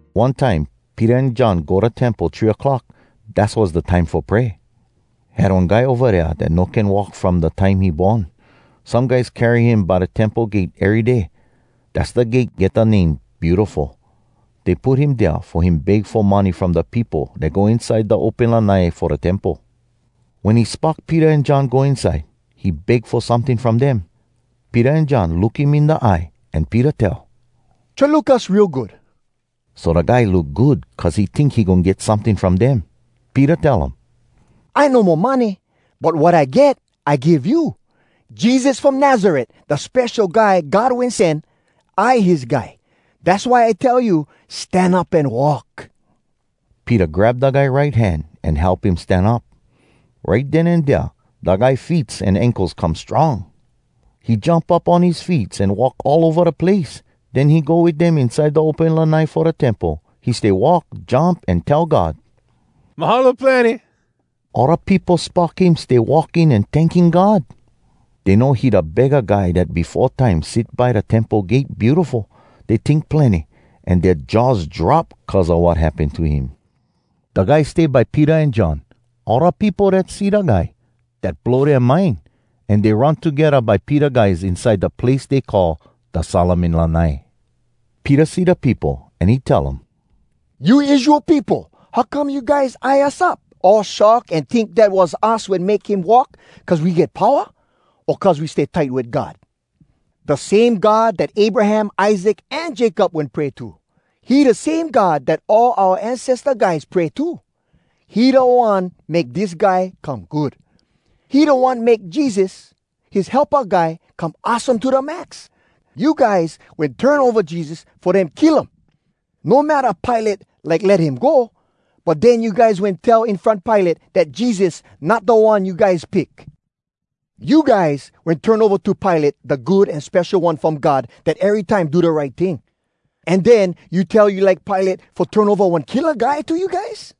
One time Peter an John go da Temple three clock. Dass was da time fo pray. Had one guy ova dea dat no can walk from da time he born. Some guys carry him by da Temple gate ery day. Dass da gate get da name “Beautiful.” Dey put him dea fo him beg fo money from da peopo dat go inside da open lanai fo da Temple. Wen he spock Peter an John go inside, he beg fo someting from dem. Peter an John look him in da eye, an Peter tell, “Try look us real good!” So da guy look good cuz he tink he goin get someting from dem. Peter tell um, “I no mo money, but wat I get, I give you. Jesus from Nazaret, da Spesho Guy God Wen Sen, I his guy. Dass why I tell you, stan up an walk!” Peter grab da guy right hand an help him stan up. Right den an dea da guy feets an ankles come strong. He jump up on his feets an walk all ova da place. Den he go wit dem inside da open lanai fo da Temple. He stay walk, jump, an tell God “Mahalo plenny!” All da peopo spock him stay walking an tanking God. Dey know he da begga guy dat befo time sit by da Temple gate “Beautiful.” Dey tink plenny, an dea jaws drop cuz a wat happen to him. Da guy stay by Peter an John. All da peopo dat see da guy, dat blow dea mind, an dey run togedda by Peter guys inside da place dey call da “Solomon Lanai.” Peter see da peopo, an he tell um, “You Israel peopo, how come you guys eye us up all shock an tink dat was us wen make him walk cuz we get powa, o cuz we stay tight wit God? Da same God dat Abraham, Isaac, an Jacob wen pray to, he da same God dat all oua ancesta guys pray to. He da One make dis guy come good. He da One make Jesus, his helpa guy, come awesome to da max. You guys wen turn ova Jesus fo dem kill um. No matta Pilate like let him go, but den you guys wen tell in front Pilate dat Jesus not da one you guys pick. You guys wen turn ova to Pilate da Good An Spesho One From God dat erytime do da right ting, an den you tell you like Pilate fo turn ova one killa guy to you guys.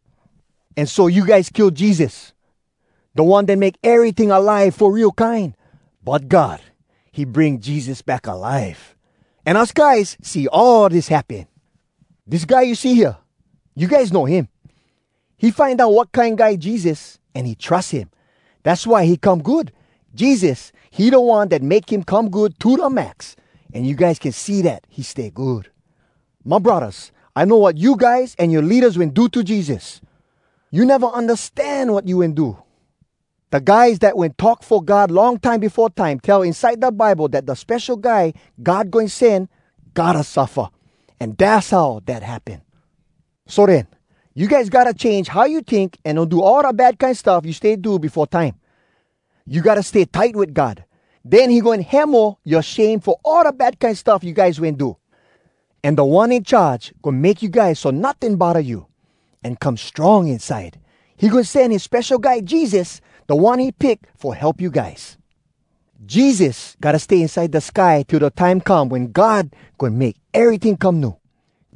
An so you guys kill Jesus, da One dat make eryting alive fo real kine. But God, he bring Jesus back alive. An us guys see all dis happen. Dis guy you see hea, you guys know him. He find out wat kine guy Jesus, an he trus him. Dass why he come good. Jesus, he da One dat make him come good to da max! An you guys can see dat he stay good. “My braddahs, I know wat you guys an yoa leadas wen do to Jesus. You neva undastan wat you wen do! Da guys dat wen talk fo God long time befo time tell inside da Bible dat da Spesho Guy God Goin Sen gotta suffa. An dass how dat happen. “So den, you guys gotta change how you tink an no do all da bad kine stuff you stay do befo time. You gotta stay tight wit God. Den he goin hemo yoa shame fo all da bad kine stuff you guys wen do. An Da One In Charge goin make you guys so notting bodda you, an come strong inside. He goin sen his Spesho Guy Jesus, da One he pick fo help you guys. Jesus gotta stay inside da sky till da time come wen God goin make eryting come new.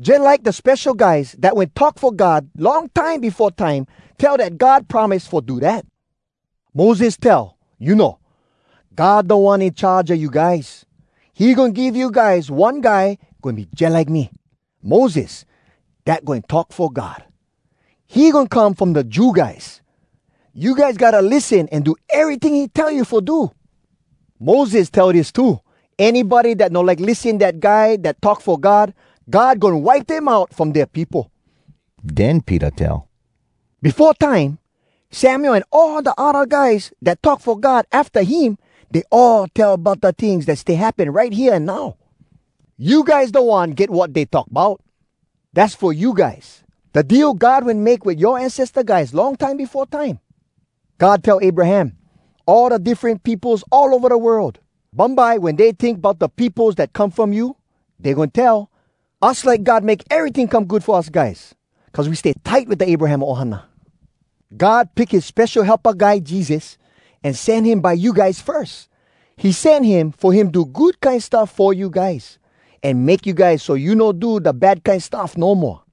Jalike da spesho guys dat wen talk fo God long time befo time tell dat God promise fo do dat. Moses tell, you know, ‘God Da One In Charge a you guys. He goin give you guys one Guy goin be jalike me, Moses, dat goin talk fo God. He goin come from da Jew guys. You guys gotta lissen an do eryting he tell you fo do.’ Moses tell dis too: ‘Anybody dat no like lissen dat Guy dat talk fo God, God goin wipe dem out from dea peopo.’” Den Peter tell, “Befo time, Samuel an all da odda guys dat talk fo God afta him, dey all tell bout da tings dat stay happen right hea an now. You guys da one get wat dey talk bout. Dass fo you guys, da deal God wen make wit yoa ancesta guys long time befo time. God tell Abraham, ‘All da diffren peopos all ova da world, bumbye wen dey tink bout da peopos dat come from you, dey goin tell, “Us like God make eryting come good fo us guys, cuz we stay tight wit da Abraham ohana!” ’ God pick his Spesho Helpa Guy Jesus, an sen him by you guys firs. He sen him fo him do good kine stuff fo you guys, an make you guys so you no do da bad kine stuff no moa.”